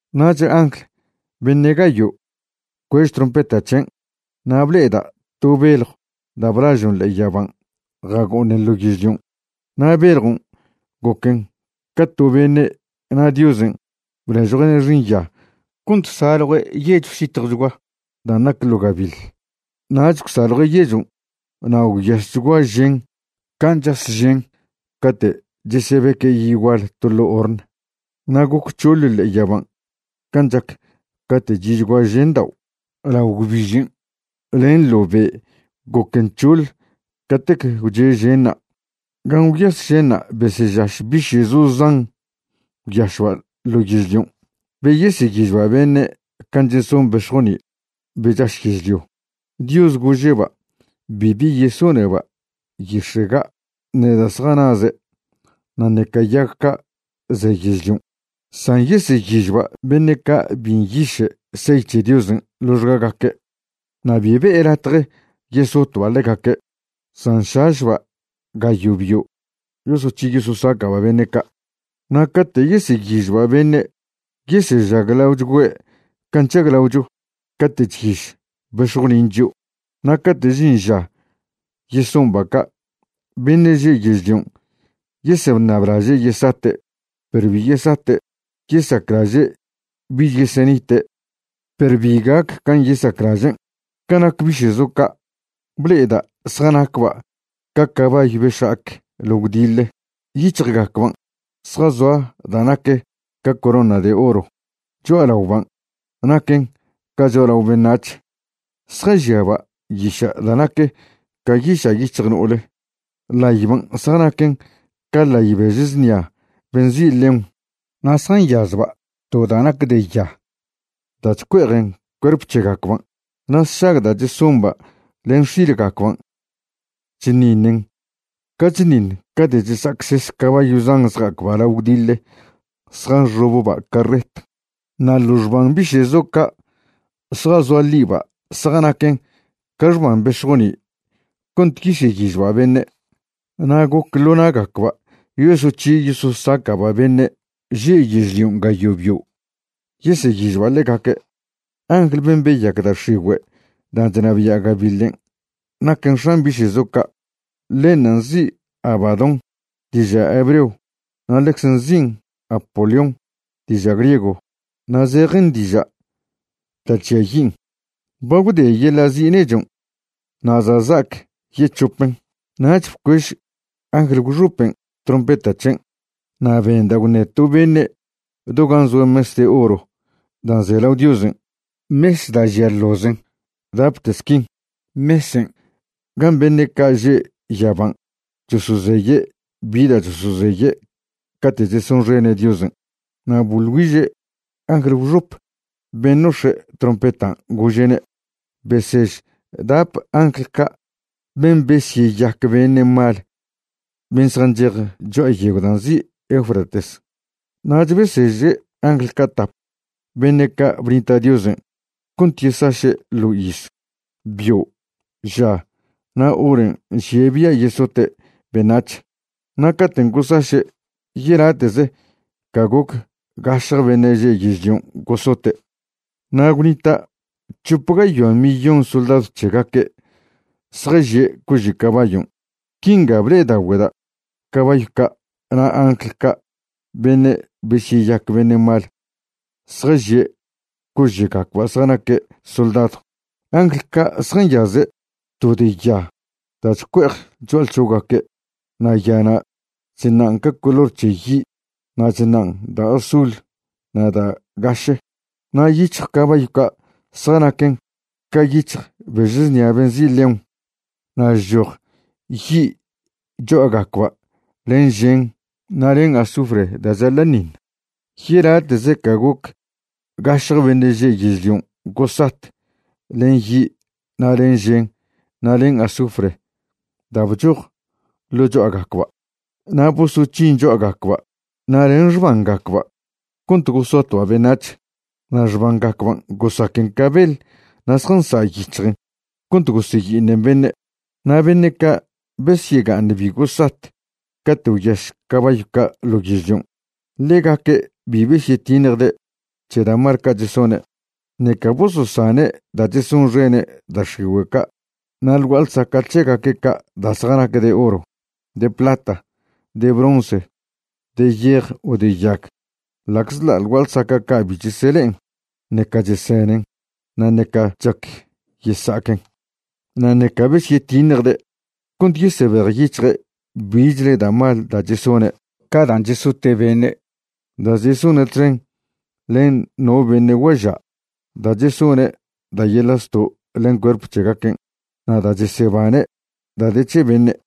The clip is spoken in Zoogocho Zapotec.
Nach angl beṉe' gayo' bcuež trompeta c̱hen' na' ble'eda' to beljw da' blažon' ḻe'e yaban' jago'oṉen ḻo yežlion'. Na' beljon' goquen ca to beṉe' na' Diosen' bnežjue'ne' xinya cont saljue' yechw zitjwchgua dan' nac ḻo gabiḻ. Nach gwsaljue' yechon' na' gwyaschgua žen can' chas žen cate' chesebeque' yi' gual to ḻo' horn. Na' goc c̱hoḻ ḻe'e yaban' can' chac cate' chi'chgua žendao', lao gwbižen' len ḻo be' goquen c̱hoḻ catec gwche' ženṉa'. Gan' gwyas ženṉa' besežaš biše'zo zan gwyašba' ḻo yežlion', be yeseyižba' beṉe' can' cheson bex̱joni' be chaš yežlio. Diosen' gože'ba' bibi yesoneba' yix̱e' ga', ṉe da' zjanaze' na' ṉeca yag ca' ze yežlion', san yeseyižba' beṉe' ca' bi nyiše' sey c̱he Diosen' ḻoxgagaque'. Na' bi be'e latje yesotba' ḻegaque', san šašba' gayo' bio' yosoc̱hi yososaca'ba' beṉe' ca'. Na' cate' yeseyižba' beṉe', yesežaglagüe' can' chžaglaocho cate' chyiž bex̱jonin' chio'. Na' cate' žin ža yesomba' ca', beṉe' že' yežlion' yeseṉablaže' yesate', perw bi yesate'; yesaclaže' bich yesenite', perw bi gac can' yesaclažen'. Ca nac biše'zo ca', ble'eda' zjanacba' ca cabayw be šja'ac ḻo gwdiḻe. Yic̱hjgacban' zjazoa da' nac ca corona de oro. Cho'alaoban' naquen ca cho'alao beṉac̱h. Zjažiaba' yiša' da' nac ca yiša' yic̱hj no'ole. Ḻayban' zjanaquen ca ḻay bež znia be nzi' león. Na' zjanyazba' to da' nac de ya da' chcue'ejen cuerp c̱hegacban'. Na' sšag da' chesomba' len x̱ilgacban' chṉiṉen ca chṉiṉ cate' chesa'acses cabayw zan zja'acba' ḻo gwdiḻe zjanxobba' carret. Na' ḻo xban biše'zo ca' zjazoa ḻiba' zjanaquen ca xban bex̱joni' cont yeseyižba' beṉe', na' goc ḻo na'gacba' yosoc̱hi yososaca'ba' beṉe' že' yežlion' gayo' bio', yeseyižba' ḻegaque'. Angl ben' beyac da' x̱igüe' dan' chnabia' gabiḻen' naquen x̱an biše'zo ca'. Ḻenṉa' nzi' Abadón diža' hebreo na' ḻecze nzin' Apolión diža' griego, na' zejen diža' Da' Chžiayin'. Ba gwde yeḻa' zi' nechon' na' za' za'ac yec̱hopen. Nach bcuež angl gwxopen' trompeta c̱hen', na' benda' gwṉe to beṉe' do gan' zoa mes de oro dan' ze lao Diosen', mes da' žia ḻozen dapte squin, mesen' gan' beṉe' ca' že' yaban' chosozeye' bi da' chosozeye' cate' chesonxene' Diosen'. Na' boḻ güiže' angl gwxop ben' nox̱e' trompetan', gože'ne': ―Besež dap angl ca' ben' besyeyac beṉe' mal ben' zjanchej cho'a yegw da' nzi' Eufrates. Nach beseže' angl ca' tap beṉe' ca' bnita' Diosen' cont yesaše' ḻo iz, bio', ža na' horen' nžie' bia' yesote' beṉac̱h, na' caten' gosaše', yelate'ze ca goc gašje beṉe' že' yežlion' gosote'. Na' gwnita' c̱hop gayoa millón soldadw c̱hegaque' zjažie' cože' cabayon'. Quinga ble'edaogüeda' cabayw ca' na' angl ca' beṉe' besyeyac beṉe' mal zjažie' cože'gacba' zjanaque' soldadw. Angl ca' zjanyaze' to de ya da' chcue'ej cho'alc̱ho'gaque' na' yana' chṉan' ca color c̱he yi' na' chṉan' da' azul na' da' gaše. Na' yic̱hj cabayw ca' zjanaquen ca yic̱hj bež znia be nzi' león, na' chchoj yi' cho'agacba' len žen na' len azufre da' chaḻa'ṉiṉ. Yelate'ze ca goc gašje beṉe' že' yežlion' gosat len yi' na' len žen na' len azufre da' bchoj ḻo cho'agacba'. Na' bosoc̱hin cho'agacba' na' len xbangacba' cont gosotba' beṉac̱h, na' xbangacban' gosaquen ca beḻ na' zjansa' yic̱hjen cont goseyi'iṉen beṉe'. Na' beṉe' ca' besyega'aṉ bi gosat cate' gwyaš cabayw ca' ḻo yežlion', ḻegaque' bi besyetiṉjde' c̱he da' mal ca' chesone', ṉeca bososane' da' chesonxene' da' x̱igüe' ca' na' ḻ gua'a ḻsaca' c̱hegaque' ca' da' zjanac de oro, de plata, de bronce, de yej o de yag, ḻa'czḻa' ḻ gua'a ḻsaca' ca' bi chesele'en, ṉeca chesenen, na' ṉeca chac yesa'aquen. Na' ṉeca besyetiṉjde' cont yesebejyic̱hje' bichle da' mal da' chesone', ca dan' chesote' beṉe', da' chesone' txen len no beṉe' guaža', da' chesone' da' yeḻa' zto' len cuerp c̱hegaquen', na' da' chesebane' da' de c̱he beṉe'.